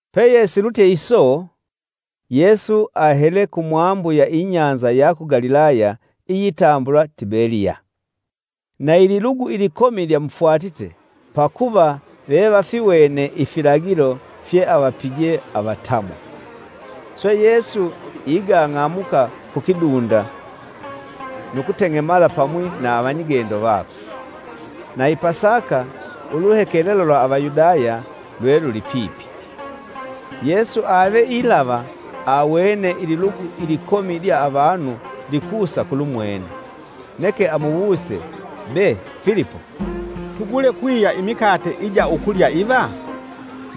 Peyesilutye iso, Yesu ahele kumwambu ya ibahali ya ku Galilaya iyitambulwa (Tibeliya.) Na Ililugu ilikomi lyamufwatite, pakuva vevafiwene ifilagilo fye avapije avatamwa. Swe Yesu igang'amuka kukidunda nu kuteng'emala pamwi na avanyigendo vakwe. Na i Pasaka, uluhekelelo lwa Avayudaya lwe lulipipi. Yesu ave ilava, awene ililugu ilikomi lya avanu likusa kulumwene, neke amuwuse Be! Filipo, “Tugule kwiya imikate ija ukulya iva?” (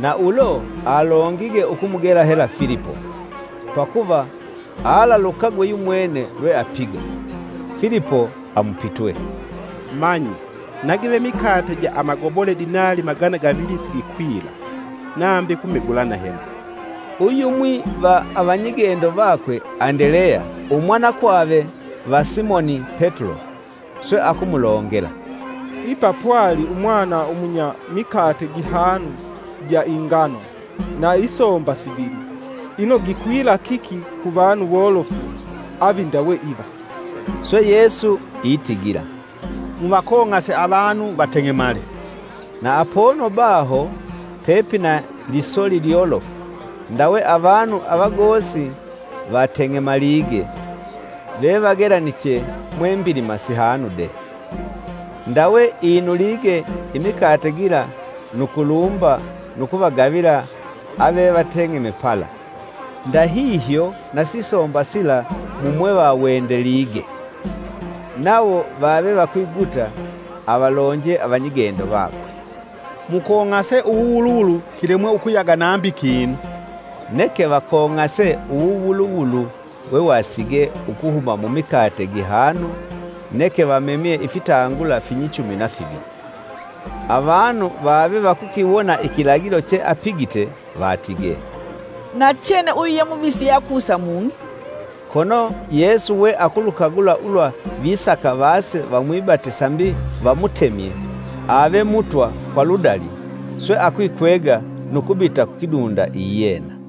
Na ulo alongige ukumugela hela Filipo; pakuva alalukagwe yumwene lwe apiga.) Filipo amupitwe, “Manyi nagive mikate ja amagobole dinali magana gavili sigikwila, nambi kumegulana hela!” Uyumwi va avanyigendo vakwe, Andeleya, umwanakwave va Simoni Petulo, swe akumulongela, “Ipa pwali umwana umunya mikate gihanu ja ingano na isomba sivili; ino gikwila kiki kuvanu wolofu avi ndawe iva.” Swe Yesu itigila, “Muvakong'ase avanu vateng'emale,” Na apono baho pepina lisoli lyolofu ndawe avanu avagosi vateng'emalige; vevagelaniche mwe mbilima sihanu de. Ndawe inulige imikate gila nu kulumba nu kuvagavila avevateng'eme pala, ndahihyo na sisomba sila mumwevawendelige. Nawo vave vakwiguta avalonje avanyigendo vakwe, “Mukong'ase uwuwuluwulu kilemwe ukuyaga nambi kinu.” Neke vakong'ase uwuwuluwulu wewasige ukuhuma mumikate gihanu neke vamemye ifitangula finyichumi na fivili. Avanu vavevakukiwona ikilagilo che apigite vatige, “Nachene uyu ye Muvisi yeakusa mung'i.” Kono Yesu we akulukagula ulwa visaka vase vamwibate sambi vamutemye ave Mutwa kwa ludali; swe akwikwega nu kubita kukidunda iyena.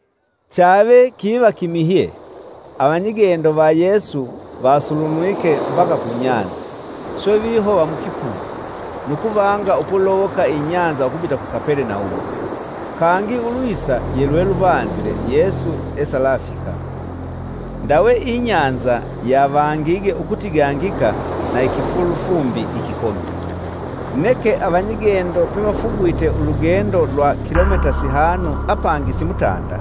Chave kiva kimihye, avanyigendo va Yesu vasulunwike mbaka kunyanza, swe vihova mukipugu, nu kuvanga ukulowoka inyanza ukubita ku Kapelenaumu. Kangi ulwisa yelweluvanzile Yesu esalafika. Ndawe inyanza yavangige ukutigangika na ikifulufumbi ikikomi. Neke Avanyigendo pevafugwite ulugendo lwa kilomita sihanu apangi simutanda,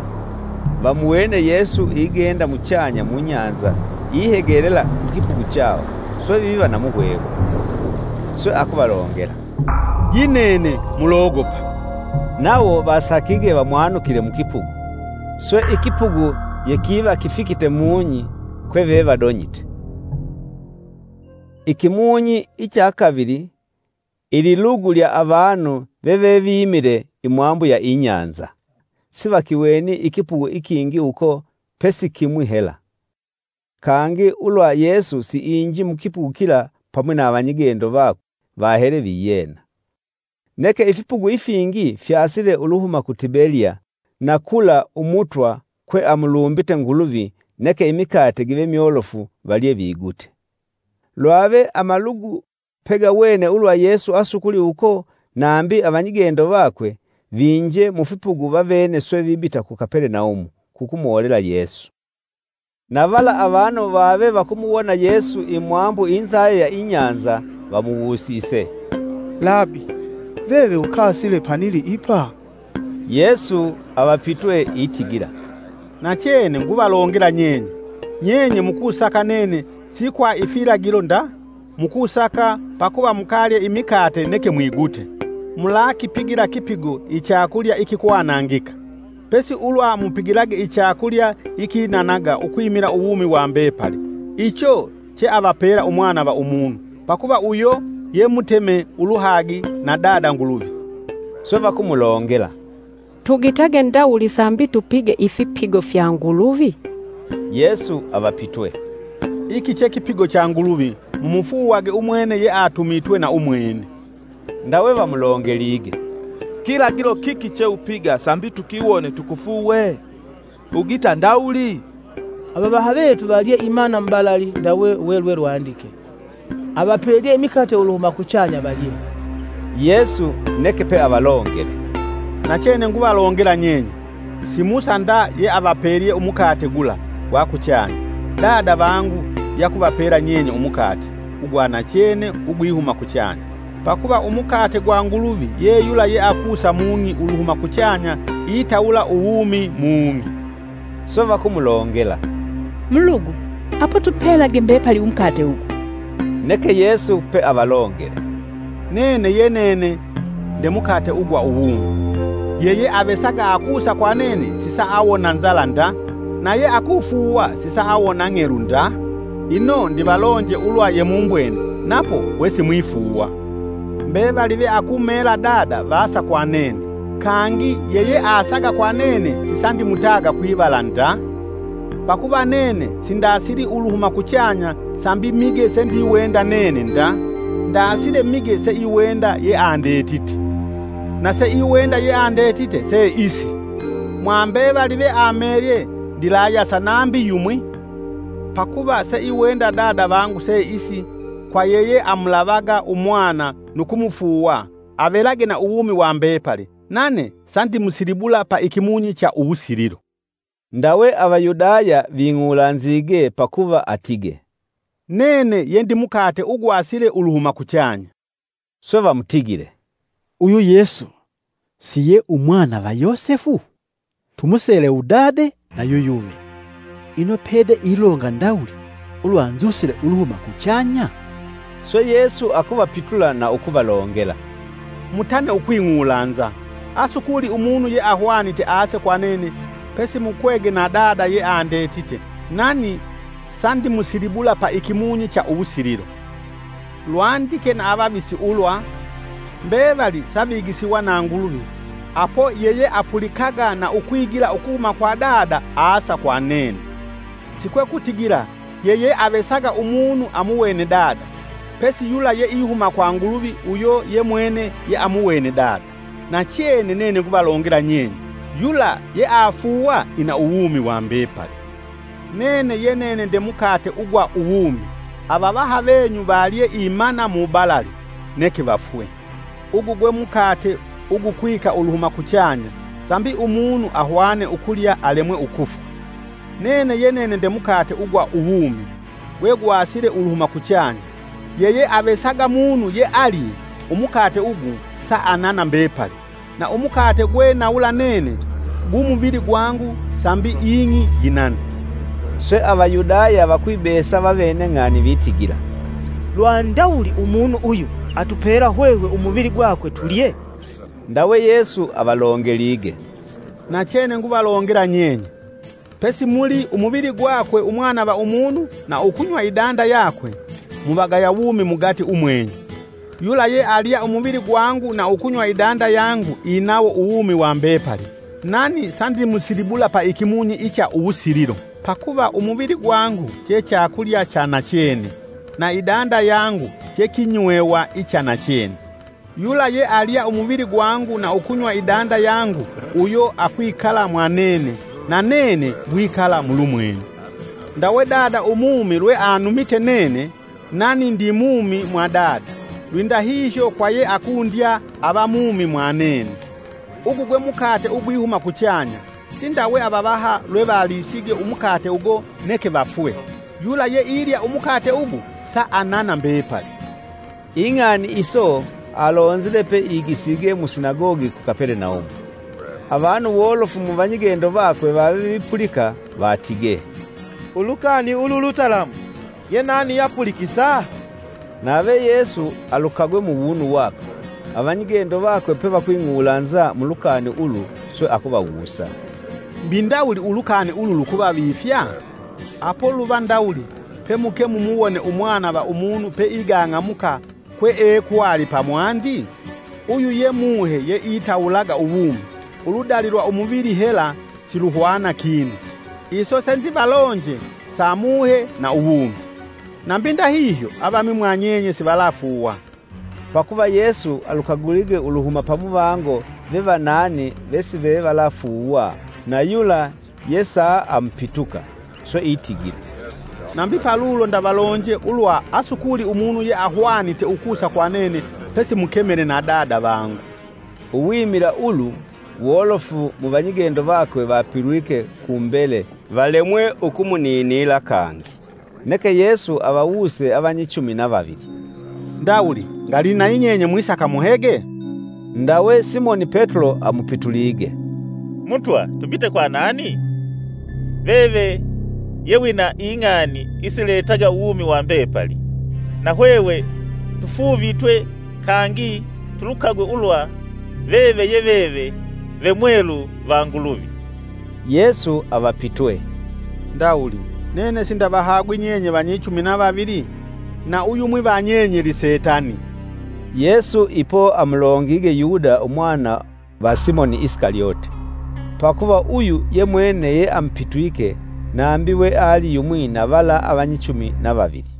vamuwene Yesu igenda muchanya munyanza ihegelela kukipugu chawo swe viva na muhwehwe. Swe akuvalongela, “Yinene, mulogopa!” Nawo vasakige vamwanukile mukipugu, swe ikipugu yekiva kifikite mung'i kweve vadonyite. Ikimunyi icha kavili ililugu lya avanu vevevimile imwambu ya inyanza sivakiwene ikipugu ikingi uko pesi kimwi hela. Kangi ulwa Yesu siinji mukipugu kila pamwi na avanyigendo vakwe vahele viyena. Neke ifipugu ifingi fyasile uluhuma ku Tibeliya, na kula Umutwa kwe amulumbite nguluvi neke imikate give myolofu valye vigute. Lwave amalugu pegawene ulwa Yesu asukuli uko nambi avanyigendo vakwe, viinje mufipugu vavene swe vibita ku Kapelenaumu, kukumwolela Yesu. Na vala avanu vave vakumuwona Yesu imwambu inzayo ya inyanza vamuwusise, “Labi veve ukasile panili ipa?” Yesu avapitwe itigila, “Nachene nguvalongela nyenye: nyenye mukusaka nene si kwa ifilagilo nda mukusaka pakuva mukalye imikate neke mwigute. Mulakipigila kipigo ichakulya ikikwanangika, pesi ulwa mupigilage ichakulya ikinanaga ukwimila uwumi wa mbepali, icho che avapela Umwana va Umunu. Pakuva uyo, ye muteme uluhagi na dada Nguluvi.” Swe vakumulongela, “Tugitage ndawuli sambi tupige ifipigo fya Nguluvi?” Yesu avapitwe, “Iki chekipigo cha Nguluvi mumufuuwage umwene yeatumitwe na umwene.” Ndawe vamulongelige, “Kilagilo kiki che upiga sambi tukiwone tukufuuwe? Ugita ndawuli? Avavaha vetu valye imana mubalali ndawe welwelwandike ‘Avapelye imikate uluhuma kuchanya valye.’” Yesu neke peavalongele, “Nachene nguvalongela nyenye. Si Musa nda yeavapelye umukate gula gwa kuchanya, Dada vangu yakuvapela nyenye umukate ugwa nachene ugwihuma kuchanya. Pakuva umukate gwa Nguluvi ye yula yeakusa mung'i uluhuma kuchanya itawula uwumi mung'i.” “Swe vakumulongela, Mulugu apo tupelage mbepali umukate ugu.” “Neke Yesu peavalongele nene yenene nde mukate ugwa uwumi. Yeyeavesaga akusa kwa nene sisaawona nzala nda na yeakufuuwa sisaawona ng'elu nda. Ino, ndivalonje ulwa yemumbwene napo wesimwifuuwa. Mbevali veakumela Dada vasa kwa nene; kangi yeyeasaga kwa nene sisandimutaga kwivala nda. pakuva nene si ndasili uluhuma kuchanya sambi mige sendiwenda nene nda, ndasile mige seiwenda yeandetite. Naseiwenda yeandetite se isi: mwa mbevali veamelye ndilayasa nambi yumwi. Pakuva seiwenda Dada vangu se isi kwa yeyeamulavaga Umwana nu kumufuuwa avelage na uwumi wa mbepali nane sandimusilibula pa ikimunyi cha uwusililo.” Ndawe Avayudaya ving'ulanzige pakuva atige, “Nene yendi mukate ugwasile uluhuma kuchanya.” Swe vamutigile, “Uyu Yesu si ye Umwana va Yosefu? Tumusele Udade na yuyuve. Ino pede ilonga ndawuli ulwa nzusile uluhuma kuchanya?” Swe Yesu akuvapitula na ukuvalongela, “Mutane ukwing'ulanza. Asukuli umunu yeahwanite ase kwa nene pesi mukwege na Dada yeandetite nani sandimusilibula paikimunyi cha uwusililo. Lwandike na Avavisi ulwa: ‘Mbevali savigisiwa na Nguluvi, apo yeyeapulikaga na ukwigila ukuhuma kwa Dada asa kwa nene. Sikwekutigila yeyeavesaga umunu amuwene Dada; pesi yula yeihuma kwa Nguluvi uyo yemwene yeamuwene Dada. Nachene nene nguvalongela nyenye, yula yeafuuwa ina uwumi wa mbepali. Nene ye nene nde mukate ugwa uwumi. Avavaha venyu valye imana mubalali, neke vafwe. Ugu gwe mukate ugukwika uluhuma kuchanya, sambi ahwane ukulya alemwe ukufwa. Nene ye nene nde mukate ugwa uwumi gwegwasile uluhuma kuchanya. Yeyeavesaga munu yealye umukate ugu saanana mbepali; na umukate gwe nawula nene gu muvili gwangu sambi ing'i yinane.” Swe Avayudaya vakwibesa vavene ng'ani vitigila: “Lwa ndawuli umunu uyu atupela hwehwe umuvili gwakwe tulye?” Ndawe Yesu avalongelige, “Nachene nguvalongela nyenye: pesimuli; umuvili gwakwe Umwana va Umunu na ukunywa idanda yakwe, muvagaya wumi mugati umwenyu. Yula yealya umuvili gwangu na ukunywa idanda yangu inawo uwumi wa mbepali, nani sandimusilibula paikimunyi icha uwusililo. Pakuva umuvili gwangu che chakulya cha nachene; na idanda yangu che kinywewa icha na chene. Yula yealya umuvili gwangu na ukunywa idanda yangu uyo akwikala mwanene, na nene ngwikala mulumwene. Ndawe Dada umumi lweanumite nene, nani ndimumi mwa Dada, lwindahihyo kwa yeakundya ava mumi mwa nene. Ugu gwe mukate ugwihuma kuchanya. Sindawe avavaha lwevalisige umukate ugo neke vafwe; yula yeilya umukate ugu saanana mbepali.” Ing'ani iso alonzile peigisige musinagogi ku Kapelenaumu. Avanu wolofu muvanyigendo vakwe vave vipulika vatige, “Ulukani ulu lutalamu! Yenani ye apulikisa?” Nave Yesu alukagwe muwunu wakwe, avanyigendo vakwe pevakwing'ulanza mulukani ulu swe akuvawusa, “Mbi ndawuli ulukani ulu lukuvavifya? Apo luva ndawuli pemuke mumuwone Umwana va Umunu pe igang'amuka kweekwali pamwandi? Uyu ye Muhe yeitawulaga uwumi. Uludali lwa umuvili hela siluhwana kinu, iso sendivalonje sa Muhe na uwumi. Nambi ndahihyo avamwi mwa nyenye sivalafuuwa.” (Pakuva Yesu alukagulige uluhuma pamuvango vevanani vesive valakufuuwa na yula yesaamupituka.) Swe itigila, “Nambi palulo ndavalonje ulwa asukuli Umunu yeahwanite ukusa kwa nene pesi mukemele na Dada vangu.” Uwimila ulu wolofu muvanyigendo vakwe vapilwike kumbele valemwe ukumuninila kangi. Neke Yesu avawuse avanyichumi na vavili, “Ndawuli ngali nayinyenye mwisaka muhege?” Ndawe Simoni Petulo amupitulige, “Mutwa tubite kwa nani? Veve ye wina ing'ani isiletaga uwumi wa mbepali. Nahwehwe tufuuvitwe kangi tulukagwe ulwa veve ye veve ve Mwelu va Nguluvi.” Yesu avapitwe, “Ndawuli nene sindavahagwi nyenye vanyichumi na vavili? Na uyumwi vanyenye lisetani!” Yesu ipo amulongige Yuda umwana va Simoni Isikalyote. Pakuva uyu yemwene yeamupitwike nambi we ali yumwi na vala avanyichumi na Vavili.